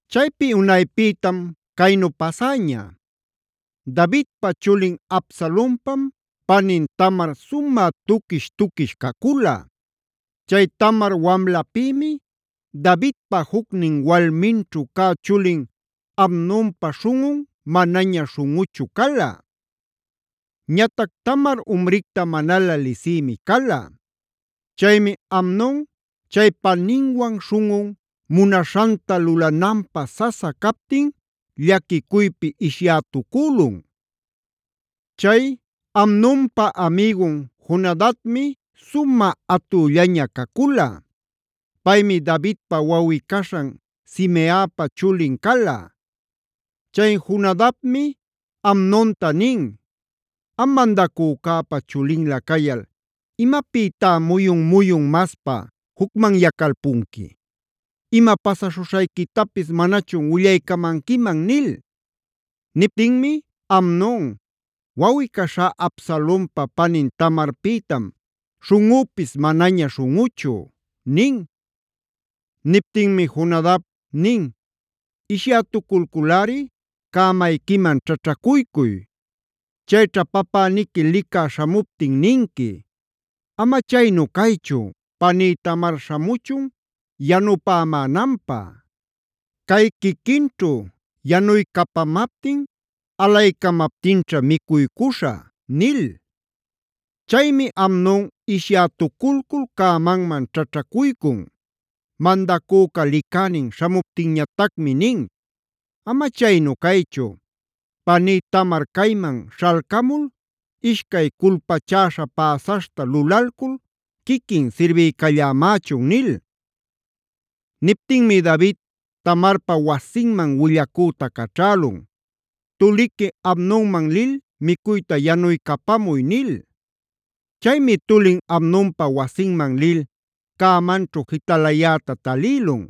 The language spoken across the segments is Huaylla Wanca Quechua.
Chaypi unaypïtam caynu pasäña: Davidpa chulin Absalonpam panin Tamar sumä tuquish-tuquish cacula. Chay Tamar wamlapïmi Davidpa juc walminćhu cä chulin Amnonpa śhunꞌun manaña śhunꞌuchu cala. Ñatac Tamar umricta manalä lisïmi cala. Chaymi Amnon chay paninwan śhunꞌun munaśhanta lulananpä sasa captin llaquicuypi ishyätucülun. Chay Amnonpa amigun Jonadabmi sumä atüllaña cacula. Paymi Davidpa wawꞌi-caśhan Simeapa chulin cala. Chay Jonadabmi Amnonta nin: “Am mandacücäpa chulinlä cayal ¿imapïtá muyun-muyun maspa jucmanyacalpunqui? ¿Ima pasaśhuśhayquitapis manachun willaycamanquiman?” nil. Niptinmi Amnon: “Wawꞌi-caśhá Absalonpa panin Tamarpïtam śhunꞌüpis manaña śhunꞌuchu” nin. Niptinmi Jonadab nin: “Ishyätuculculꞌari cämayquiman ćhaćhacuycuy. Chayćha papäniqui licä śhamuptin ninqui: ‘Ama chaynu caychu paní Tamar śhamuchun yanupämänanpä. Cay quiquinćhu yanuycapamaptin alaycamaptinćha micuycuśhä’” nil. Chaymi Amnon ishyätuculcul cämanman ćhaćhacuycun. Mandacüca licänin śhamuptinñatacmi nin: “Ama chaynu caychu, paní Tamar cayman śhalcamul ishcay culpachäśha päsaśhta lulalcul quiquin sirbiycallämächun” nil. Niptinmi David Tamarpa wasinman willacüta caćhälun: “Tuliqui Amnonman lil micuyta yanuycapamuy” nil. Chaymi tulin Amnonpa wasinman lil cämanćhu jitalayäta talïlun.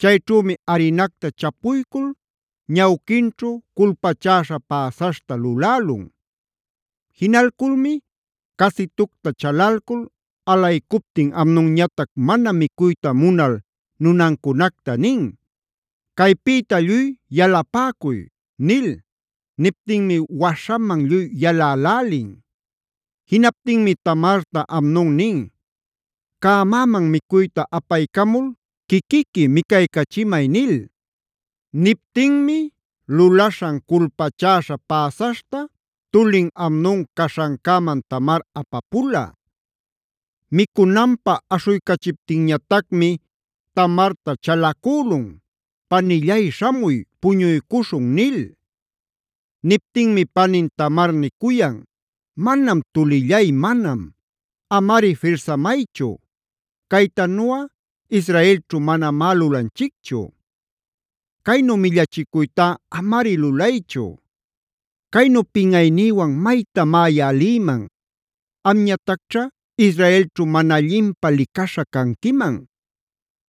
Chayćhümi arinacta chapuycul ñawquinćhu culpachäśha päsaśhta lulälun. Jinalculmi casitucta chalalcul alaycuptin Amnonñatac mana micuyta munal nunancunacta nin: “¡Caypïta lluy yalapäcuy!” nil. Niptinmi waśhaman lluy yalälälin. Jinaptinmi Tamarta Amnon nin: “Cämäman micuyta apaycamul quiquiqui micaycachimay” nil. Niptinmi lulaśhan culpachäśha päsaśhta tulin Amnon caśhancäman Tamar apapula. Micunanpä aśhuycachiptinñatacmi Tamarta chalacülun: “Panillay śhamuy, puñuycuśhun” nil. Niptinmi panin Tamar nicuyan: “¡Manam, tullillay manam! Amari firsamaychu. Caytanuꞌa Israelćhu manamá lulanchicchu. Caynu millachicuytá amari lulaychu. Caynu pinꞌaynïwan maytamá yaꞌa lïman. Amñatacćha Israelćhu mana allinpä licaśha canquiman.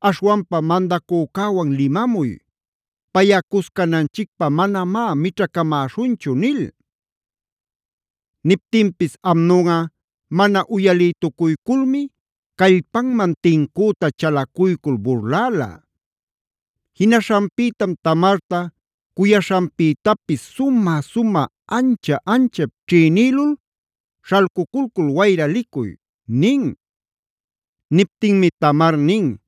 Aśhwanpa mandacücäwan limamuy. Payꞌa cuscananchicpä manamá mićhacamäśhunchu” nil. Niptinpis Amnonꞌa mana uyalïtucuyculmi callpanman tincüta chalacuycul burläla. Jinaśhanpïtam Tamarta cuyaśhanpïtapis sumä-sumä, ancha-anchap ćhïnïlul: “Śhalcuculcul wayra licuy” nin. Niptinmi Tamar nin: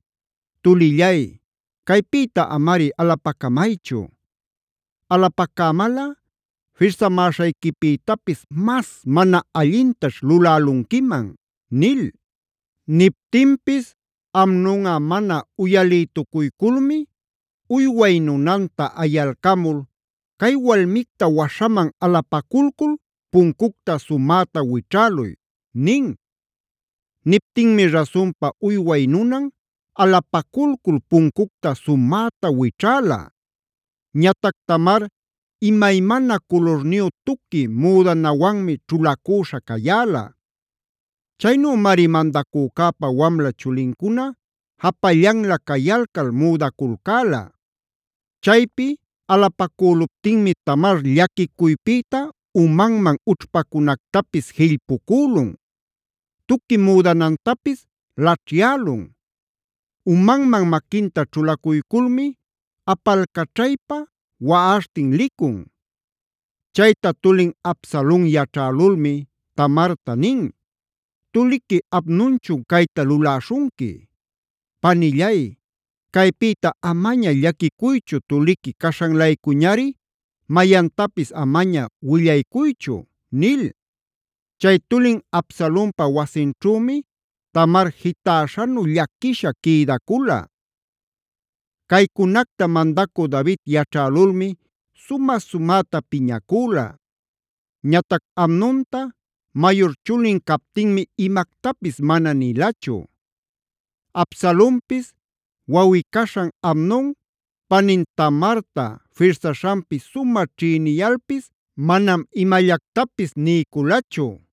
“¡Tulillay, caypïta amari alapacamaychu! Alapacämalꞌa firsamäśhayquipïtapis mas mana allintaćh lulälunquiman” nil. Niptinpis Amnonꞌa mana uyalïtucuyculmi, uyway nunanta ayalcamul: “Cay walmicta waśhaman alapaculcul puncucta sumäta wićhäluy” nin. Niptinmi rasunpa uyway nunan alapaculcul puncucta sumäta wićhäla. Ñatac Tamar imaymana culurniyu tuqui müdanawanmi ćhulacüśha cayäla. Chaynümari mandacücäpa wamla chulincuna japallanlä cayalcal müdaculcäla. Chaypi alapacüluptinmi Tamar llaquicuypïta umanman ućhpacunactapis jillpucülun, tuqui müdanantapis laćhyälun; umanman maquinta ćhulacuyculmi apalcaćhaypa waꞌaśhtin licun. Chayta tulin Absalon yaćhälulmi Tamarta nin: “¿Tuliqui Amnonchun cayta luläśhunqui? Panillay, caypïta amaña llaquicuychu tuliqui caśhan-laycuñari mayantapis amaña willaycuychu” nil. Chay tulin Absalonpa wasinćhümi Tamar jitäśhanu llaquisha quïdacula. Caycunacta mandacü David yaćhälulmi sumä-sumäta piñacüla. Ñatac Amnonta mayur chulin captinmi imactapis mana nilachu. Absalonpis wawꞌi-caśhan Amnon panin Tamarta firsaśhanpi sumä ćhïniyalpis manam imallactapis niyculachu.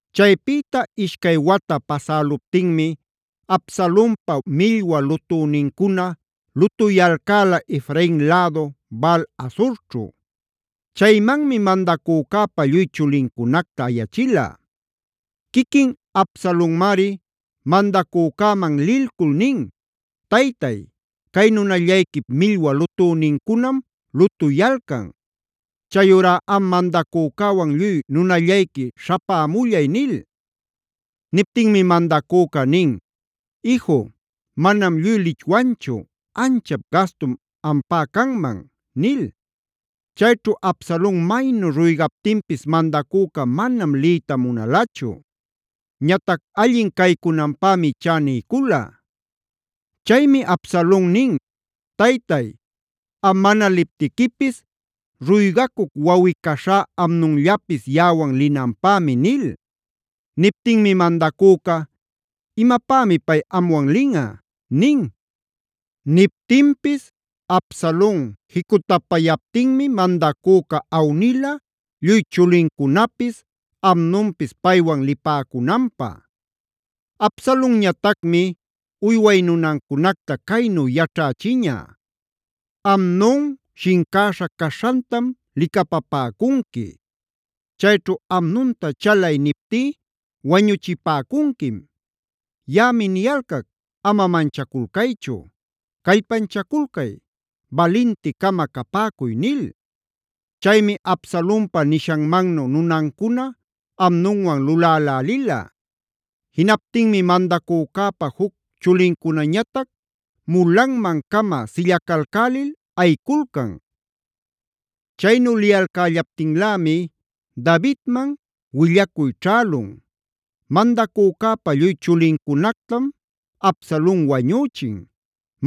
Chaypïta ishcay wata pasäluptinmi Absalonpa millwa lutünincuna lutuyalcäla Efrain lädu Baal-hazorćhu. Chaymanmi mandacücäpa lluy chulincunacta ayachila. Quiquin Absalonmari mandacücäman lilcul nin: “Taytay, cay nunallayquip millwa lutünincunam lutuyalcan. Chayurá am mandacücäwan lluy nunallayqui śhapämullay” nil. Niptinmi mandacüca nin: “Iju, manam lluy lichwanchu. Anchap gastum ampä canman” nil. Chayćhu Absalon maynu ruygaptinpis mandacüca manam liyta munalachu. Ñatac allin caycunanpämi ichá niycula. Chaymi Absalon nin: “Taytay, am mana liptiquipis ruygacuc wawꞌi-caśhá Amnonllapis yaꞌawan linanpämi” nil. Niptinmi mandacüca: “¿Imapämi pay amwan linꞌa?” nin. Niptinpis Absalon jicutapayaptinmi mandacüca awnila lluy chulincunapis, Amnonpis paywan lipäcunanpä. Absalonñatacmi uyway nunancunacta caynu yaćhächiña: “Amnon shincäśha caśhantam licapapäcunqui. Chayćhu ‘Amnonta chalay’ niptí wañuchipäcunquim. Yaꞌami niyalcac ama manchaculcaychu. Callpanchaculcay, balinti-cama capäcuy” nil. Chaymi Absalonpa nishanmannu nunancuna Amnonwan lulälälila. Jinaptinmi mandacücäpa juc chulincunañatac mulanman-cama sillacalcälil ayiculcan. Chaynu liyalcällaptinlämi Davidman willacuy ćhälun: “Mandacücäpa lluy chulincunactam Absalon wañüchin.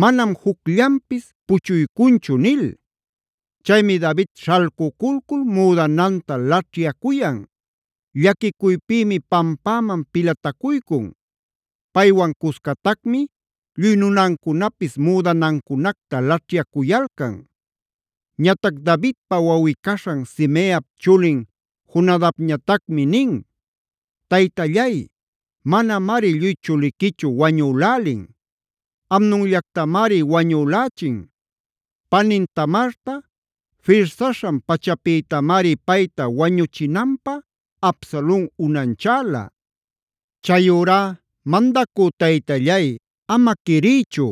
Manam jucllanpis puchuycunchu” nil. Chaymi David śhalcuculcul müdananta laćhyacuyan; llaquicuypïmi pampäman pilatacuycun. Paywan cuscatacmi lluy nunancunapis müdanancunacta laćhyacuyalcan. Ñatac Davidpa wawꞌi-caśhan Simeap chulin Jonadabñatacmi nin: “Taytallay, manamari lluy chuliquichu wañülälin; Amnonllactamari wañülächin. Panin Tamarta firsaśhan-pachapïtamari payta wañuchinanpä Absalon unanchäla. Chayurá mandacü taytallay, ama quiriychu: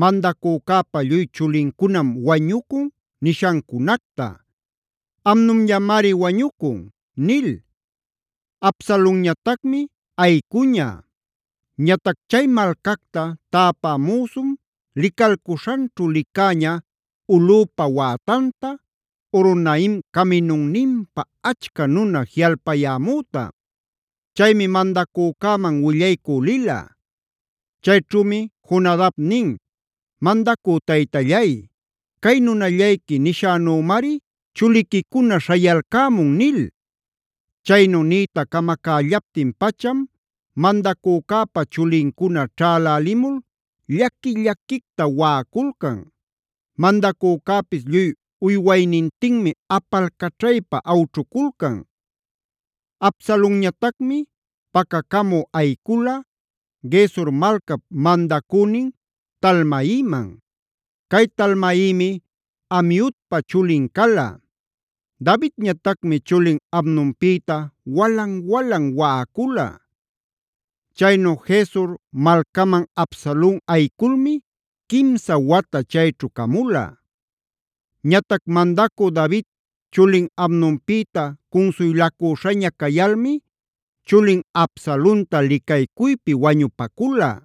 ‘Mandacücäpa lluy chulincunam wañucun’ nishancunacta. Amnonllamari wañucun” nil. Absalonñatacmi ayicuña. Ñatac chay malcacta täpä müsum licalcuśhanćhu licäña ulꞌüpa wätanta, Horonaim caminunninpa achca nuna jiꞌalpayämüta. Chaymi mandacücäman willaycü lila. Chayćhümi Jonadab nin: “Mandacü taytallay, cay nunallayqui nishänümari chuliquicuna śhayalcämun” nil. Chaynu niyta camacällaptin-pacham mandacücäpa chulincuna ćhalälimul llaqui-llaquicta waꞌaculcan. Mandacücäpis lluy uywaynintinmi apalcaćhaypa awćhuculcan. Absalonñatacmi pacacamü ayicula Gesur malcap mandacünin Talmaiman. Cay Talmaimi Amiudpa chulin cala. Davidñatacmi chulin Amnonpïta walan-walan waꞌacula. Chaynu Gesur malcaman Absalon ayiculmi quimsa wata chayćhu camula. Ñatac mandacü David chulin Amnonpïta cunsuylacüśhaña cayalmi chulin Absalonta licaycuypi wañupacula.